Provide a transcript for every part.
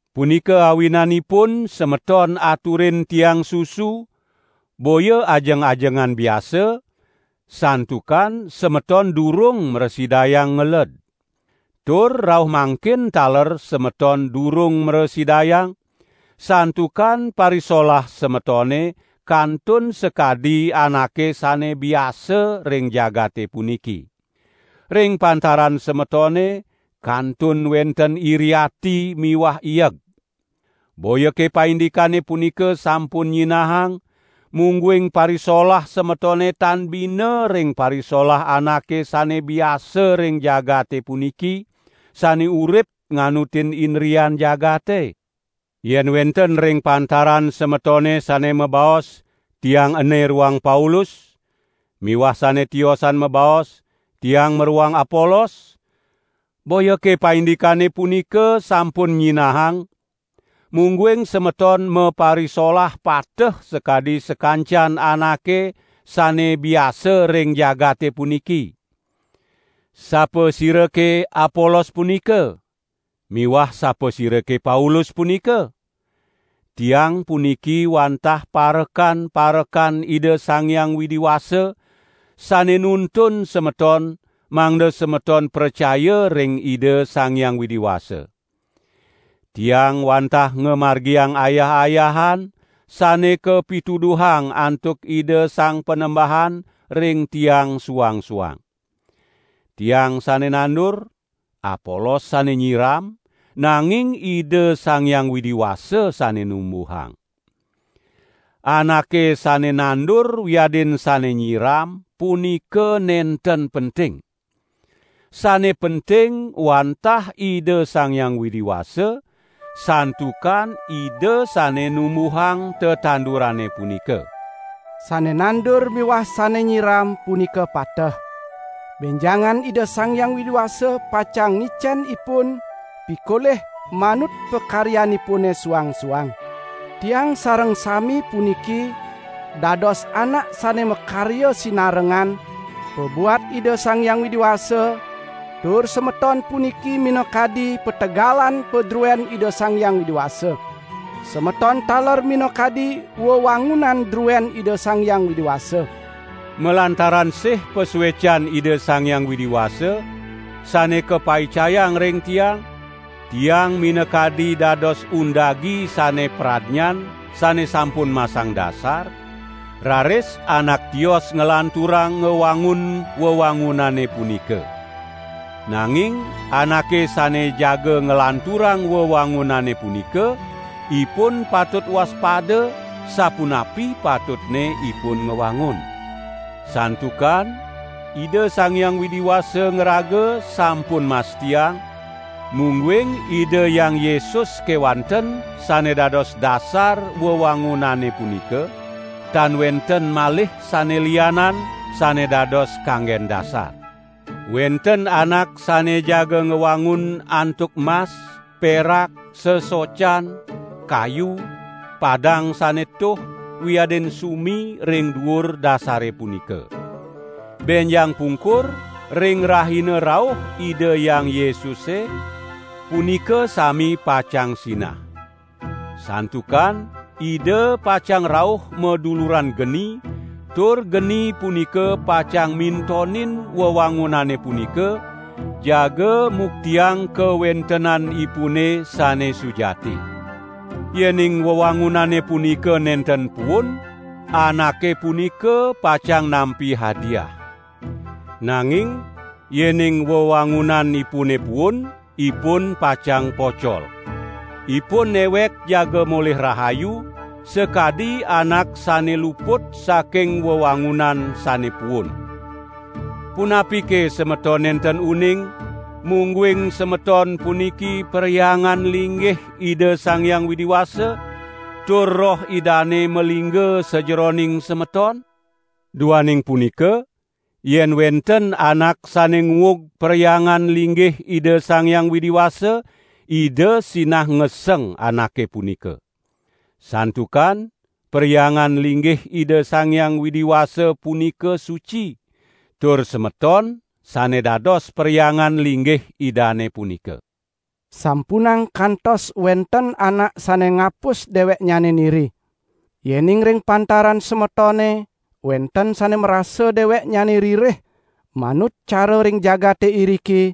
Punika awinanipun semeton aturin tiang susu, boya ajeng-ajengan biasa, santukan semeton durung mrasidayang ngeled. Tur rauh mangkin taler semeton durung mrasidayang, santukan parisolah semetone kantun sakadi anake sane biasa ring jagate puniki. Ring pantaran semetone kantun wenten iri ati miwah ieg. Boyake paindikane punika sampun nyinahang, mungguing parisolah semetone tan bina ring parisolah anake sane biasa ring jagate puniki, sane urip nganutin indrian jagate? Yen wenten ring pantaran semetone sane mabaos: "Tiang ene roang Paulus", miwah sane tiosan mabaos: "Tiang maroang Apolos", boyake paindikane punika sampun nyinahang, mungguing semeton maparisolah pateh sakadi sakancan anake sane biasa ring jagate puniki? Sapasirake Apolos punika? Miwah sapasirake Paulus punika? Tiang puniki wantah parekan-parekan Ida Sang Hyang Widi Wasa sane nuntun semeton mangda semeton pracaya ring Ida Sang Hyang Widi Wasa. Tiang wantah ngamargiang ayah-ayahan, sane kapituduhang antuk Ida Sang Panembahan ring tiang suang-suang. Tiang sane nandur, Apolos sane nyiram, nanging Ida Sang Hyang Widi Wasa sane numbuhang. Anake sane nandur wiadin sane nyiram punika nenten penting. Sane penting wantah Ida Sang Hyang Widi Wasa, santukan Ida sane numbuhang tetandurane punika. Sane nandur miwah sane nyiram punika pateh; benjangan Ida Sang Hyang Widi Wasa pacang ngicen ipun pikolih manut pakaryanipune suang-suang. Tiang sareng sami puniki dados anak sane makarya sinarengan pabuat Ida Sang Hyang Widi Wasa, tur semeton puniki minakadi pategalan padruen Ida Sang Hyang Widi Wasa. Semeton taler minakadi wewangunan druen Ida Sang Hyang Widi Wasa. Malantaran sih pasuecan Ida Sang Hyang Widi Wasa, sane kapaicayang ring tiang, tiang minakadi dados undagi sane pradnyan sane sampun masang dasar, raris anak tios nglanturang ngwangun wewangunane punika. Nanging anake sane jaga nglanturang wewangunane punika, ipun patut waspada sapunapi patutne ipun ngwangun. Santukan Ida Sang Hyang Widi Wasa ngraga sampun mastiang, mungguing Ida Hyang Yesus kewanten sane dados dasar wewangunane punika, tan wenten malih sane lianan sane dados kanggen dasar. Wenten anak sane jaga ngwangun antuk mas, perak, sesocan, kayu, padang sane tuh, wiadin sumi ring duur dasare punika. Benjang pungkur ring rahina rauh Ida Hyang Yesuse, punika sami pacang sinah. Santukan Ida pacang rauh maduluran geni, tur geni punika pacang mintonin wewangunane punika, jaga muktiang kawentenanipune sane sujati. Yening wewangunane punika nenten puun, anake punika pacang nampi hadiah. Nanging yening wewangunanipune puun, ipun pacang pocol. Ipun newek jaga molih rahayu, sakadi anak sane luput saking wewangunan sane puun. Punapike semeton nenten uning, mungguing semeton puniki perhyangan linggih Ida Sang Hyang Widi Wasa, tur Roh Idane malingga sajeroning semeton? Duaning punika yen wenten anak sane nguug perhyangan linggih Ida Sang Hyang Widi Wasa, Ida sinah ngeseng anake punika. Santukan perhyangan linggih Ida Sang Hyang Widi Wasa punika suci, tur semeton sane dados perhyangan linggih Idane punika. Sampunang kantos wenten anak sane ngapus deweknyane niri. Yening ring pantaran semetone wenten sane marasa deweknyane ririh manut cara ring jagate iriki,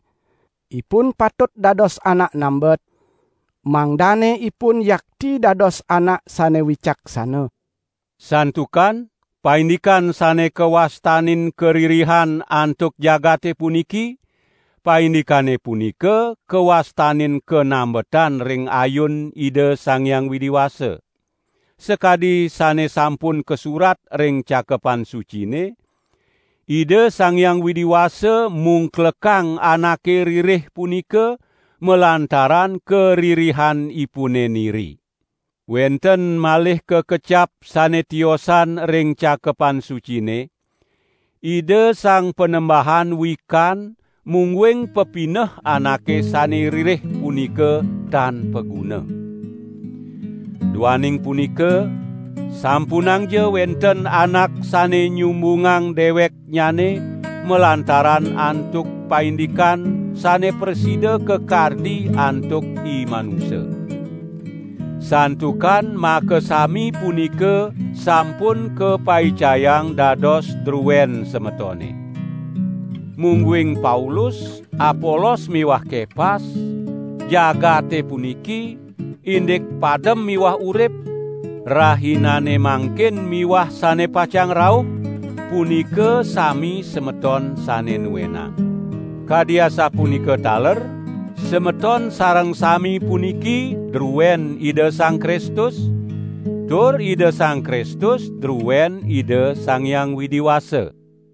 ipun patut dados anak nambet, mangdane ipun yakti dados anak sane wicaksana. Santukan paindikan sane kawastanin karirihan antuk jagate puniki, paindikane punika kawastanin kanambetan ring ayun Ida Sang Hyang Widi Wasa. Sakadi sane sampun kasurat ring Cakepan Sucine: "Ida Sang Hyang Widi Wasa mungklekang anake ririh punika malantaran karirihanipune niri." Wenten malih kakecap sane tiosan ring Cakepan Sucine: "Ida Sang Panembahan wikan mungguing pepineh anake sane ririh punika tan paguna." Duaning punika sampunangja wenten anak sane nyumbungang deweknyane malantaran antuk paindikan sane prasida kakardi antuk imanusa. Santukan makasami punika sampun kapaicayang dados druen semetone. Mungguing Paulus, Apolos miwah Kepas, jagate puniki, indik padem miwah urip, rahinane mangkin miwah sane pacang rauh, punika sami semeton sane nuenang. Kadi asapunika taler semeton sareng sami puniki druen Ida Sang Kristus, tur Ida Sang Kristus druen Ida Sang Hyang Widi Wasa.